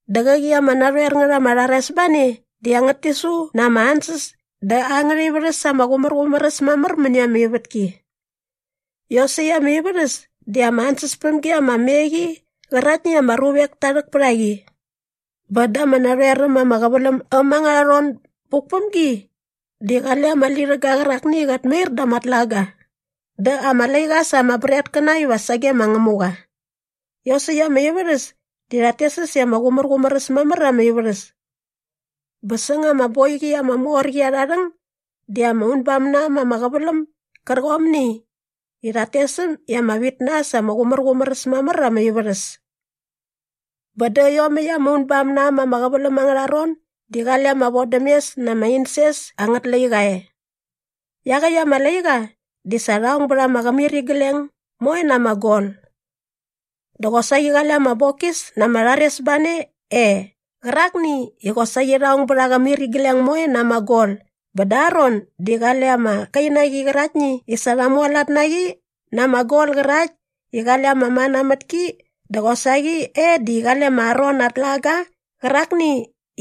Dä qäqi ama narhoer ngät ama rharesbane di angät tisu na ama ansäs dä angärha ivärhäs ama qumärqumär äs mamär mäni ama ivätki. Iosäkt ama ivärhäs di ama ansäspämgi ama me qi qäraktni i ama ruvek ta rhäk pät a qi. Bä da ama narhoer äm ama qäväläm äm angärha ron buk päm gi di qale ama lirhäga qärakni i qat mair da ama tlaga dä ama laiqa sä ama bretkäna iva sage ma Ngämuqa. Iosäkt ama ivärhäs di rhat tes äs i ama qumärqumär äs mamär ama ivärhäs. Bä säng ama boiqi ama mor qi arha rhäng di ama unbam na äm ama qäväläm gärqomni i rhat tes äm i ama vit na äs ama qumärqumär äs mamär ama ivärhäs. Bä dä iomäkt ama unbam na äm ama qäväläm angärha ron di qale ama vodämes na ama insens angät laiqa e. Iaqäkt ama laiqa di sa rha ong bät aa qämirigleng moe na ama gol. Dä qosaqi qale ama bokis na ama rharesbane e qärakni i qosaqi sa rha ong bät aa qämirigleng moe na ama gol bä da aa ron di qale ama kainaqi qäraktni i sa rha mualat na qi na ama gol qärakt i qale ama mana mät ki dä qosaqi e di qale ma Aron aa tlaga qärakni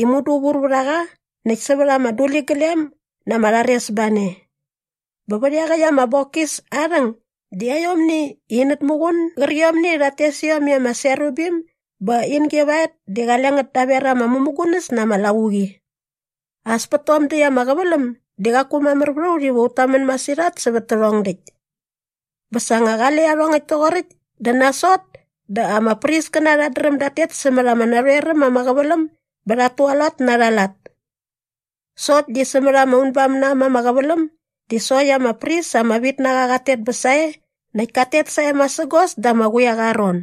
i mudu vur vät a qa näkt sävät ama duliglem na ama rharesbane. Bä vät iaqäkt ama bokis aa rhäng di aiomni inät muqun gärqiomni i rhat tes iom i ama serubim bä in givaet di qale ngät daver ama mämugunäs na ama lavuqi. As pät tom däkt ama qäväläm di qaku mamär vät a ut iva ut tamän masirhat sävät tärhong däkt. Bä sa nga qale iarhongäkt toqoräkt dä nasot dä ama priskäna rhat dräm dat tet sämät ama narhoer äm ama qäväläm bä rhat tualat na arha lat sokt di sämät ama unbam na äm ama qäväläm di sokt ama pris ama vit na qa qat tet bä sae näkt kat tet sae masägos da ama quiaqa aa ron.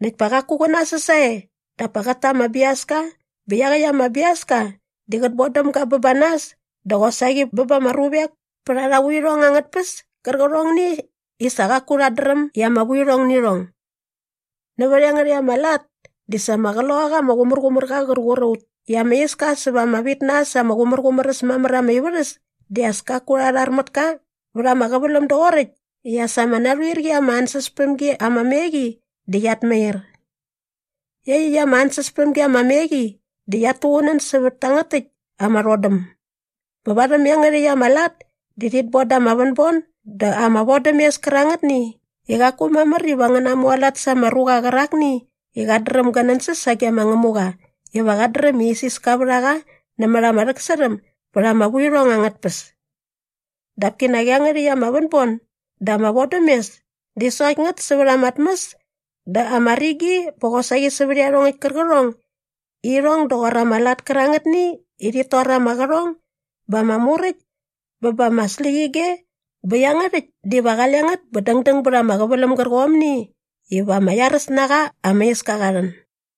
Näkt pa qaku qä nasäs sae dap pa qät ta ama biaska bä iaqäkt ama biaska di qät bodäm ga bä ba nas dä qosaqi bä ba ama ruvek pät arha vuirhong angät tpäs kärqärhongni i sa qaku rhat dräm i ama vuirhong nä irhong. Nävät iangärhäkt ama lat di sa ama Qloqaqa ama Qumärqumärqa qär qur a ut i ama iska säva ama vit na äs ama qumärqumär äs mamär ama ivärhäs di as kaku rha rhar mät ka vät ama qäväläm doqoräkt i as ama narhuir qi ama ansäspämgi ama me qi di qiat mair. Iaqyäkt ama ansäspämgi ama me qi di qiat tuqunän sävät tangät täkt ama rhodäm. Bä varhäm iangärhäkt ama lat di rhit bon da ama vänbon dä ama vodämes kärangätni i qaku mamär iva ngä namualat sa ama ruqa qärakni i qat dräm gä nänsäs sage ma Ngämuqa iva qat dräm i isiska vät a qa nämät ama rhäksärhäm bät ama vuirhong angät tpäs. Dap kinak iangärhäkt ama vänbon dä ama vodämes di sokt ngät sävät ama tmäs dä ama rigi bä qosaqi sävät iarhongäkt kärqärhong i irhong doqor ama lat kärangätni i rhit tor ama qärhong bä ama muräkt bä ba ama släqyige bä iangärhäkt diva qale ngät bä dängdäng bät ama qäväläm gärqomni iva ama iaräs na qa ama iska qa rhän.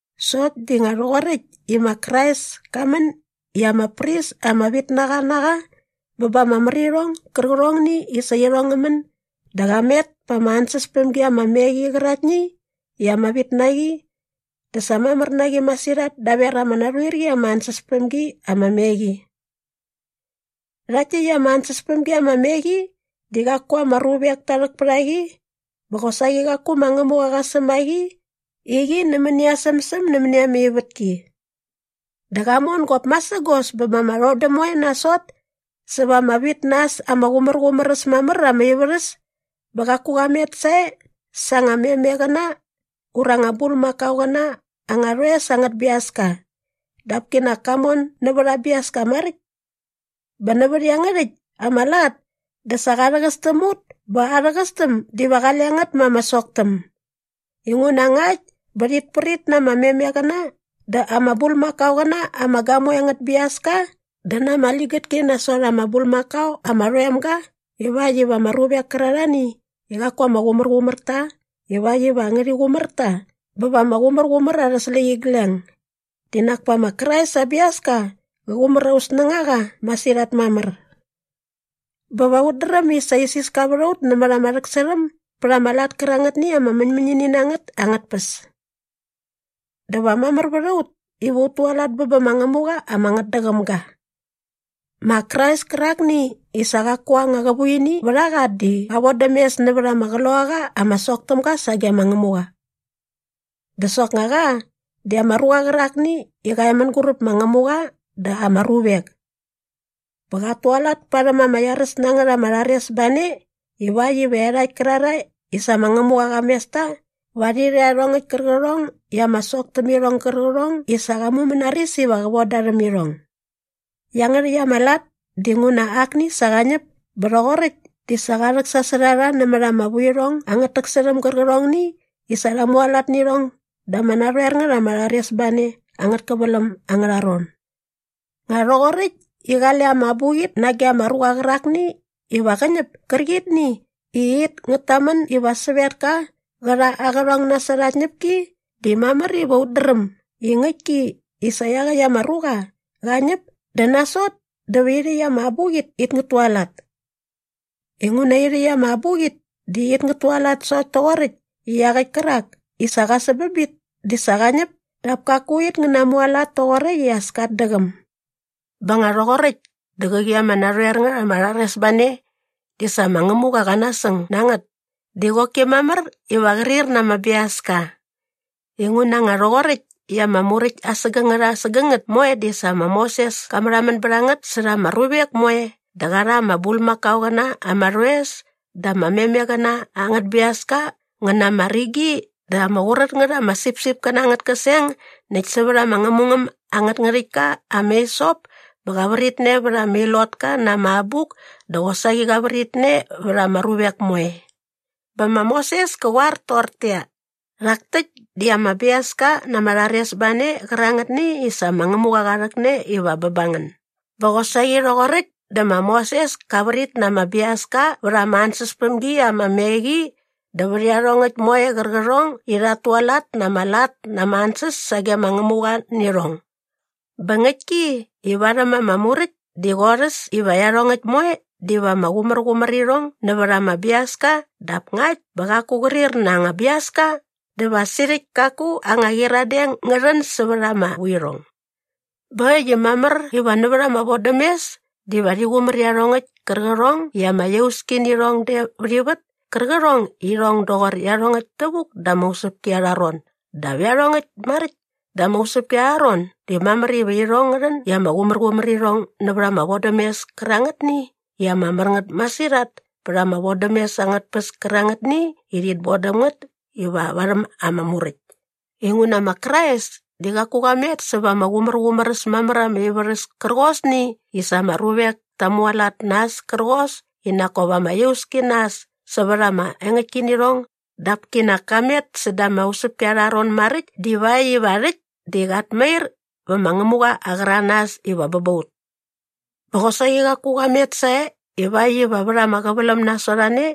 Sokt di nga rhoqoräkt i ma Krais ka män i ama pris ama vit na qa na qa bä ba ama märirhong gärqärhongni i sa irhong ngä män dä qa met pa ama ansäspämgi ama me qi qäraktni i ama vit na qi dä sa mamär na qi masirhat daver ama narhuir qi ama ansäspämgi ama me qi. Rhakt täkt ama ansäspämgi ama me qi di qaku ama ruvek ta rhäk pät a qi bä qosaqi qaku ma Ngämuqa qa säm a qi i qi nämäni aa sämsäm nämäni ama ivätki. Dä qa mon gop masägos bä ba ama rhodäm moe nasot säva ama vit na äs ama qumärqumär äs mamär ama ivärhäs bä qaku qa met sae sa anga memeqäna ura anga bulmakaoqäna angä rhoes angät biaska dap kinak ka mon nävät aa biaska maräkt. Bä nävät iangärhäkt ama lat dä sa qa rhäqäs täm ut bä aa rhäqästäm diva qale ngät ma ama soktäm. Inguna ngakt bä rhit prit na ama memeqäna dä ama bulmakaoqäna ama gamoe angät biaska dä na ama ligätki nasot ama bulmakao ama rhoem ga vät iarhakt ama ruvek kärarhani i qaku ama qumärqumär ta ivakt iva ngärhi qumär ta bä va ama qumärqumär arhä släqyigleng di nak pa ma Krais aa biaska qä qumär aut snängaqa masirhat mamär. Bä va ut dräm i sa isiska vät a ut nämät ama rhäksärhäm bät ama lat kärangätni i ama mäñmäñini na ngät angät tpäs. Dä va mamär vät a ut iva ut tualat bä bä ma Ngämuqa ama ngätdäqäm ga. Ma Krais kärakni i sa qaku anga qävuini vät a qa di qa vodäm mes nävät ama Qloqaqa ama sok täm ga sage ma Ngämuqa. Dä soknga qa di ama ruqa qärakni i qa e mänguräp ma Ngämuqa dä ama ruvek. Bä qat tualat parhäm ama iaräs na ngät ama rharesbane ivakt iva iarhakt kärarhae i sa ma Ngämuqa qa mes ta va rhi rha iarhongäkt kärqärhong i ama sok täm irhong gärqärhong i sa qa mumänaris iva qä von da rhäm irhong. Iangärhäkt ama lat dinguna akni sa qa ñäp bä rhoqoräkt di sa qa rhäksasot a rha nämät ama vuirhong angät täksärhäm gärqärhongni i sa rha mualat nä irhong da ama narhoer ngät ama rharesbane angät käväläm angärha ron. Nga rhoqoräkt i qale ama abuqit nage ama ruqa qärakni iva qä ñäp kärqitni i it ngät tamän iva sävetka qä rha aa qärhong nasot aa tñäpki di mamär iva ut dräm i ngäktki i sa iaqäkt ama ruqa qa ñäp dä nasot dä va irhäkt ama abuqit it ngät tualat. Inguna irhäkt ama abuqit di it ngät tualat sokt toqoräkt i iaqäkt kärak i sa qa säm bä bit di sa qa ñäp dap kaku it ngä namualat toqoräkt i as kat däqäm. Bä nga rhoqoräkt dä qäqi ama narhoer ngät ama rharesbane di sa ma Ngämuqa qa nasäng na ngät di qoki mamär iva qrir na ama biaska. Inguna nga rhoqoräkt i ama muräkt asägängät asägängät moe di sa ma Moses ka märhamän bät a ngät särha ama ruvek moe dä qa rha ama bulmakaoqäna ama rhoes dä ama memeqäna angät biaska ngä na ama rigi dä ama qurät ngät ama sipsipkäna angät käseng näkt sävät ama ngämungäm angät ngärhäktka ama hisop bä qa vritne vät ama ilotka na ama abuk dä qosaqi qa vritne vät ama ruvek moe. Bä ma Moses kä qoar toqortäqyia, “Rhak täkt di ama biaska na ama rharesbane qärangätni i sa ma Ngämuqa qa rhäkne iva bä ba ngän.” Bä qosaqi rhoqoräkt dä ma Moses ka vrit na ama biaska vät ama ansäspämgi ama me qi dä vät iarhongäkt moe qärqärhong i rhat tualat na ama lat na ama ansäs sage ma Ngämuqa nä irhong. Bä ngäktki i varhäm ama Muräkt di qorhäs iva iarhongäkt moe diva ama qumärqumär irhong nävät ama biaska dap ngakt bä qaku qrir na anga biaska dä va sirhäkt kaku anga qyiradeng ngä rhän sävät ama vuirhong. Bä äkt i mamär iva nävät ama vodämes diva rhi qumär iarhongäkt kärqärhong i ama iauski nä irhong de vät ivät kärqärhong i irhong doqor iarhongäkt tävuk da ama usäpki arha ron dap iarhongäkt maräkt da ama usäpki arha ron di mamär iva irhong ngä rhän i ama qumärqumär irhong nävät ama vodämes kärangätni i ama mär ngät masirhat pät ama vodämes angät tpäs kärangätni i rhit bodäm ngät iva varhäm ama Muräkt. Inguna ma Krais di qaku qa met säva ama qumärqumär äs mamär ama ivärhäs kärqosni i sa ama ruvek ta mualat na äs kärqos i nak kop ama iauski na äs sävät ama engäktkinirhong dap kinak ka met säda ama usäpki arha ron maräkt divakt iva rhäkt di qat mair vä ma Ngämuqa aa qäranas iva bä ba ut. Bä qosaqi qaku qa met sae ivakt iva vät ama qäväläm nasot a ne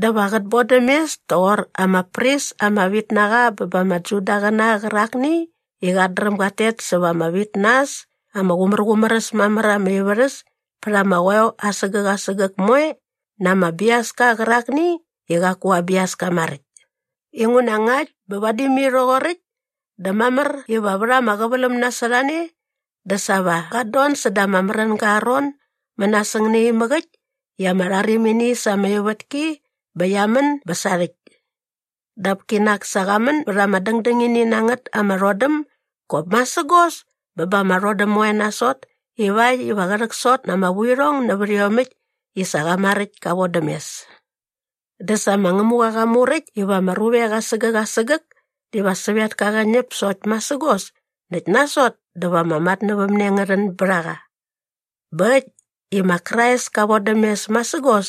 dä va qät bodäm mes toqor ama pris ama vit na qa bä ba ama Judaqäna qärakni i qat dräm gat tet säva ama vit na äs ama qumärqumär äs mamär ama ivärhäs pät ama qoeo asägäk asägäk moe na ama biaska qärakni i qaku aa biaska maräkt. Inguna ngakt bä vadi mai rhoqoräkt dä mamär iva vät ama qäväläm nasot a ne dä sa va qat don säda ama märänga aa ron mänasäng naimäk äkt i ama rharimini sa ama ivätki bä qia män bä sarhäkt. Dap kinak sa qa män bät ama dängdängini na ngät ama rhodäm gop masägos bä ba ama rhodäm moe nasot ivakt iva qä rhäksot na ama vuirhong nävät iomäkt i sa qa maräkt ka vodäm mes. Dä sa ma Ngämuqa qa muräkt iva ama ruvek asägäk asägäk diva sävetka qä ñäp sokt masägos näkt nasot dä va ama matnävämne ngä rhän bät a qa. Bä äkt i ma Krais ka vodäm mes masägos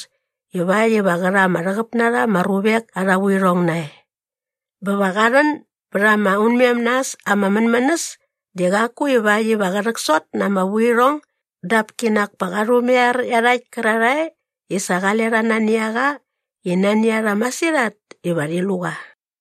ivakt iva qä rha ama rhäqäp na rha ama ruvek arha vuirhong nae. Bä va qa rhän bät aa unmem na äs aa mänmänäs di qaku ivakt iva qä rhäksot na ama vuirhong dap kinak pa qa rhumaiar iarhakt kärarhae i sa qale rha nani a qa i nani a rha masirhat iva rhi lu qa.